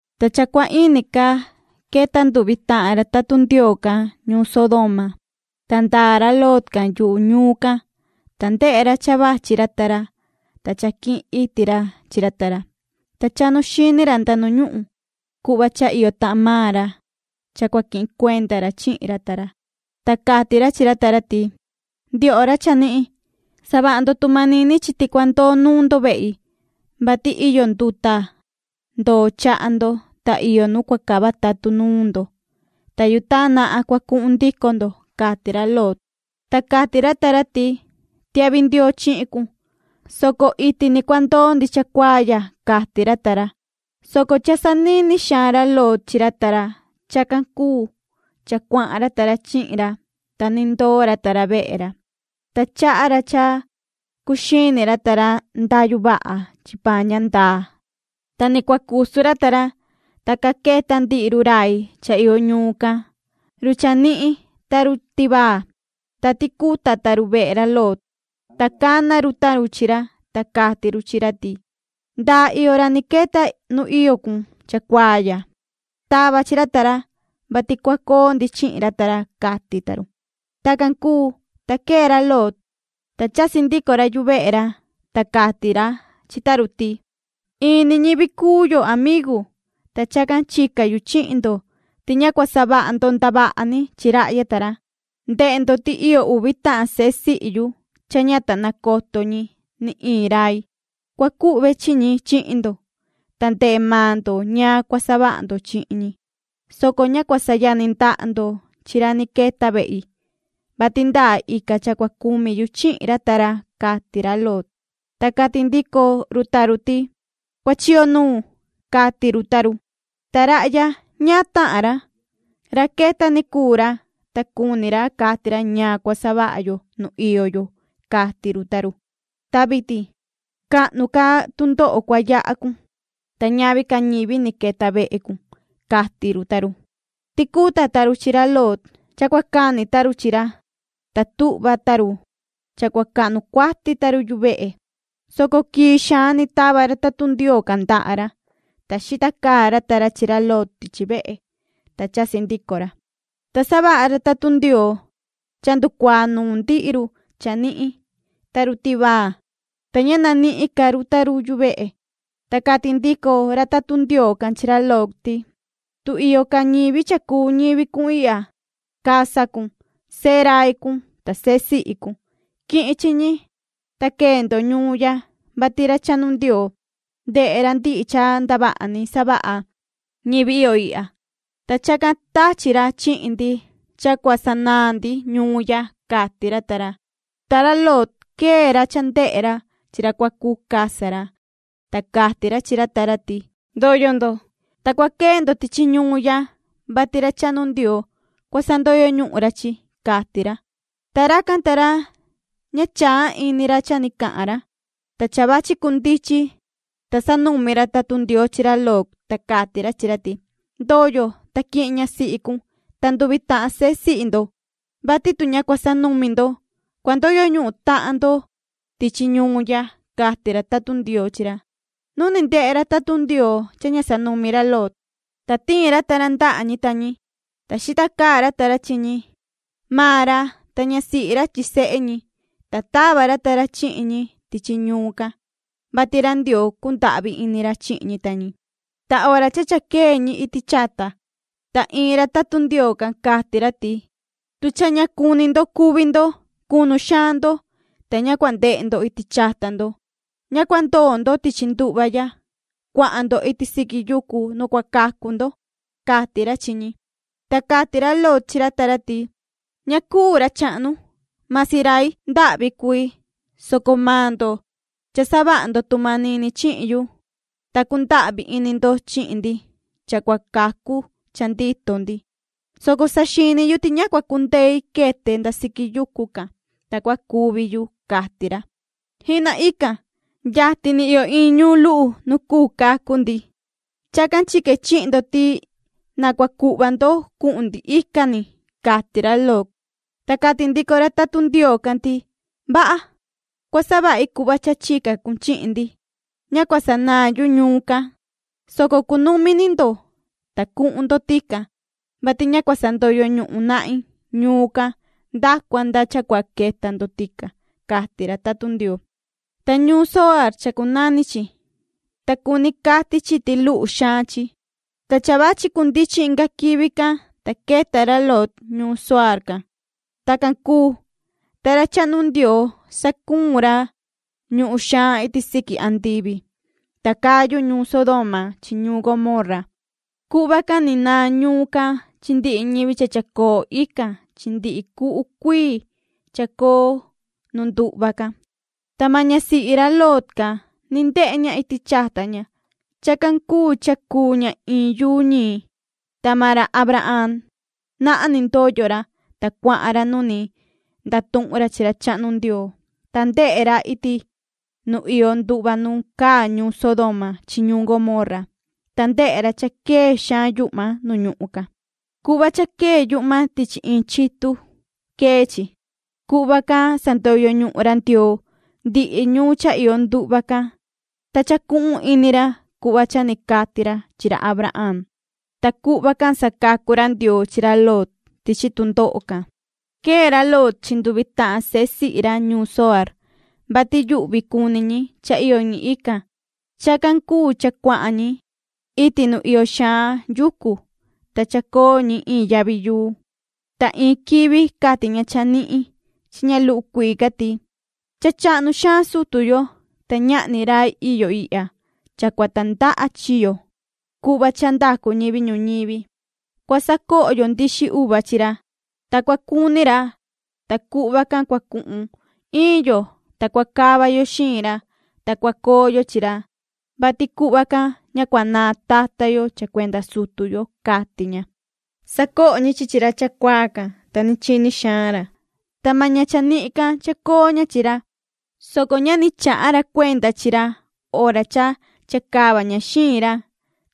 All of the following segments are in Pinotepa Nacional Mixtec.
Ta cha cua ini ca queta nduvi tahan ra tatun Ndioo can ñuun Sodoma. Ta ndaa ra Lot can yuhu ñuun can, ta ndehe ra cha vachi ra ta ra. Ta cha quihin iti ra chi ra ta ra, ta chahnu chiti ra ta taa ra nuun ra nda ñuhun cuhva cha iyo tahan maan ra cha cua quihin cuenda ra chihin ra ta ra. Ta cati ra chi ra ta ra ti: ―Ndioho ra chanihin, savaha ndo tu manini chi ti cua ndoo nuun ndo vehi, vati iyo nduta ndoo chaha ndo, ta iyo nu cua cava tatun nuun ndo. Ta yutaan nahan cua cuhun ndico ndo ―cati ra Lot. Ta cati ra ta ra ti: ―Tiahvi ndioo chihin cun, soco iti ni cua ndoo ndi cha cuaa ya ―cati ra ta ra, soco cha sanini xaan ra Lot chi ra ta ra. Chacan cuu cha cuahan ra ta ra chihin ra, ta ni ndoo ra ta ra vehe ra. Ta chaha ra cha cuxini ra ta ra ndayu vaha chi paan ña ndaa. Ta ni cua cusu ra ta ra, ta ca queta ndihi run rai cha iyo ñuun can, run chanihin ta run tivaa, ta ticuta ta run vehe ra Lot. Ta cana run ta run chi ra, ta cati run chi ra ti: ―¿Ndaa iyo ra ni queta nu iyo cun chacuaa ya? Tava chi ra ta ra, vati cua coo ndi chihin ra ta ra ―cati ta run. Tacan cuu, ta quee ra Lot, ta chasi ndico ra yuvehe ra. Ta cati ra chi ta run ti: ―In ni ñivi cuu yo, amigu, ta chacan chica yu chihin ndo ti ña cua savaha ndo ndavaha ni chi rahya ta ra. Ndehe ndo ti iyo uvi tahan sehe sihi yu cha ña ta nacoto ñi ni iin rai. Cua cuhve chi ñi chihin ndo. Ta ndehe maan ndo ñaan cua savaha ndo chihin ñi, soco ña cua sayani ndaha ndo chi ra ni queta vehi, vati ndaa ica cha cua cumi yu chihin ra ta ra ―cati ra Lot. Ta cati ndico run ta run ti: ―¡Cuachiyo nuun! ―cati run ta run―. ¿Ta rahya, ñaan tahan ra? Ra queta ni cuu ra, ta cuni ra cati ra ñaan cua savaha yo nu iyo yo ―cati run ta run―. ¡Ta vitin cahnu ca tundoho cua yaha cun, ta ñavi ca ñivi ni queta vehe cun! ―cati run ta run. Ticuta ta run chi ra Lot cha cua cani ta run chi ra, ta tuhva ta run cha cua cahnu cuati ta run yuvehe, soco quii xaan ni tava ra tatun Ndioo can ndaha ra, ta xita caa ra ta ra chi ra Lot tichi vehe, ta chasi ndico ra. Ta savaha ra tatun Ndioo cha nducuaa nuun ndihi run chanihin ta run tivaa, ta ña nanihin ca run ta run yuvehe. Ta cati ndico ra tatun Ndioo can chi ra Lot ti: ―Tu iyo ca ñivi cha cuu ñivi cun ihya, casa cun, sehe rai cun ta sehe sihi cun, quihin chi ñi, ta quee ndo ñuun ya, vati ra chahnu Ndioo ndehe ra ndihi cha ndavaha ni savaha ñivi iyo ihya, ta chacan tachi ra chihin ndi cha cua sanaan ndi ñuun ya ―cati ra ta ra. Ta ra Lot quee ra cha ndehe ra chi ra cua cuu casa ra, ta cati ra chi ra ta ra ti: ―¡Ndoyo ndo, ta cua quee ndo tichi ñuun ya, vati ra chahnu Ndioo cua sandoyo ñuhun ra chi! ―cati ra. Ta racan ta ra ña chaa ini ra cha ni cahan ra. Ta cha vachi cundichin, ta sanumi ra tatun Ndioo chi ra Lot, ta cati ra chi ra ti: ―Ndoyo, ta quihin ñasihi cun ta nduvi tahan sehe sihi ndo, vati tu ña cua sanumi ndo, cua ndoyo ñuhun tahan ndo tichi ñuun ya ―cati ra tatun Ndioo chi ra. Nu ni ndehe ra tatun Ndioo cha ña sanumi ra Lot, ta tiin ra ta ra ndaha ñi ta ñi, ta xita caa ra ta ra chi ñi, maan ra ta ñasihi ra chi sehe ñi, ta tava ra ta ra chihin ñi tichi ñuun can, vati ra Ndioo cundahvi ini ra chihin ñi ta ñi. Ta hora cha cha quee ñi iti chata, ta iin ra tatun Ndioo can cati ra ti: ―¡Tu cha ña cuni ndo cuvi ndo, cunu xaan ndo! Ta ña cua ndehe ndo iti chata ndo. Ña cua ndoo ndo tichi nduhva ya. ¡Cuahan ndo iti siqui yucu nu cua cacu ndo! ―cati ra chi ñi. Ta cati ra Lot chi ra ta ra ti: ―Ña cuu, ra chahnu. Masi rai ndahvi cui, soco maan ndo cha savaha ndo tu manini chihin yu, ta cundahvi ini ndo chihin ndi cha cua cacu cha ndito ndi, soco saxini yu ti ña cua cundei quete nda siqui yucu can, ta cua cuvi yu ―cati ra ―. ¡Jihna ican! Yatin ni iyo iin ñuun luhu nu cuu cacu ndi. Chacan chique chihin ndo ti na cua cuhva ndo cuhun ndi ican ni ―cati ra Lot. Ta cati ndico ra tatun Ndioo can ti: ―Vaha. Cua savahi cuhva cha chica cun chihin ndi. Ña cua sanaan yu ñuun can, soco cunumi ni ndo, ta cuhun ndo tican, vati ña cua sandoyo ñuhun nahin ñuun can nda cua nda cha cua queta ndo tican ―cati ra tatun Ndioo. Ta ñuun Zoaar chacunani chi, ta cuni cati chi ti luhu xaan chi. Ta cha vachi cundichin inga quivi can, ta queta ra Lot ñuun Zoaar can. Tacan cuu, ta ra chahnu Ndioo sacuun ra ñuhun xaan iti siqui andivi, ta cayu ñuun Sodoma chi ñuun Gomorra. Cuhva can ni naan ñuun can chi ndihi ñivi cha chacoo ican chi ndihi cuhu cuii chacoo nu nduhva can. Ta maan ñasihi ra Lot can ni ndehe ña iti chata ña. Chacan cuu cha cuu ña iin yuu ñii. Ta maan ra Abraham nahan ni ndoyo ra, ta cuahan ra nu ni ndatuhun ra chi ra chahnu Ndioo. Ta ndehe ra iti nu iyo nduhva nu caa ñuun Sodoma chi ñuun Gomorra, ta ndehe ra cha quee xaan yuhma nu ñuhun can. Cuhva cha quee yuhma tichi iin chitun quee chi. Cuhva can sandoyo ñuhun ra Ndioo ndihi ñuun cha iyo nduhva can, ta chacuhun ini ra cuhva cha ni cati ra chi ra Abraham, ta cuhva can sacacu ra Ndioo chi ra Lot tichi tundoho can. Quee ra Lot chi nduvi tahan sehe sihi ra ñuun Zoaar, vati yuhvi cuni ñi cha iyo ñi ican. Chacan cuu cha cuahan ñi iti nu iyo xaan yucu, ta chacoo ñi iin yavi yuu. Ta iin quivi cati ña chanihin chi ña luhu cuii ca ti: ―Cha chahnu xaan sutu yo, ta ñahni rai iyo ihya cha cua tandaha chi yo cuhva cha ndacu ñivi ñuñivi. Cua sacoho yo nduxi uva cha cha nduxaan chi ra, ta cua cuni ra, ta cuhva can cua cuhun iin yo, ta cua cava yo xiin ra, ta cua coo yo chi ra, vati cuhva can ña cua naan tata yo cha cuenda sutu yo ―cati ña. Sacoho ñi chi chi ra chacuaa can, ta ni chini xaan ra. Ta maan ña chanihin can chacoo ña chi ra, soco ña ni chaha ra cuenda chi ra hora cha chacava ña xiin ra,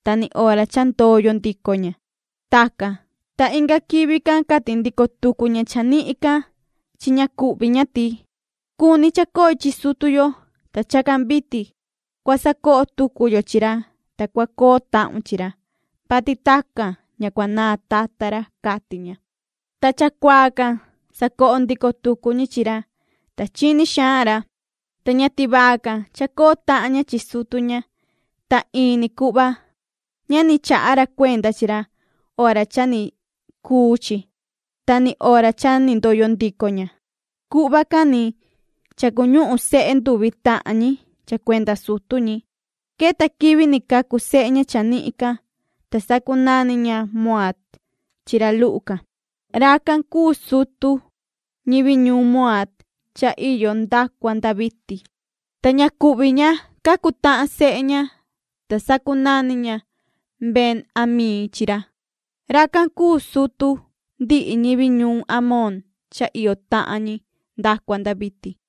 ta ni hora cha ndoyo ndico ña. Tacan, ta inga quivi can cati ndico tucu ña chanihin can chi ña cuhvi ña ti: ―Cuni chacoi chi sutu yo. Ta chacan vitin cua sacoho tucu yo chi ra, ta cua coo tahun chihin ra, vati tacan ña cua naan tata ra ―cati ña. Ta chacuaa can sacoho ndico tucu ñi chi ra, ta chini xaan ra. Ta ña tivaa can chacoo tahan ña chi sutu ña, ta in ni cuhva ña ni chaha ra cuenda chi ra hora cha ni cuu chi ta ni hora cha ni ndoyo ndico ña. Cuhva can ni cha cuñuhun sehe nduvi tahan ñi cha cuenda sutu ñi. Queta quivi ni cacu sehe ña chanihin can, ta sacunani ña Moaab chi ra luhu can. Racan cuu sutu ñivi ñuun Moaab cha iyo nda cua nda vitin. Ta ña cuhvi ña cacu tahan sehe ña, ta sacunani ña Ben-amii chi ra. Racan cuu sutu ndihi ñivi ñuhun Amón cha iyo tahan ñi nda cua nda vitin.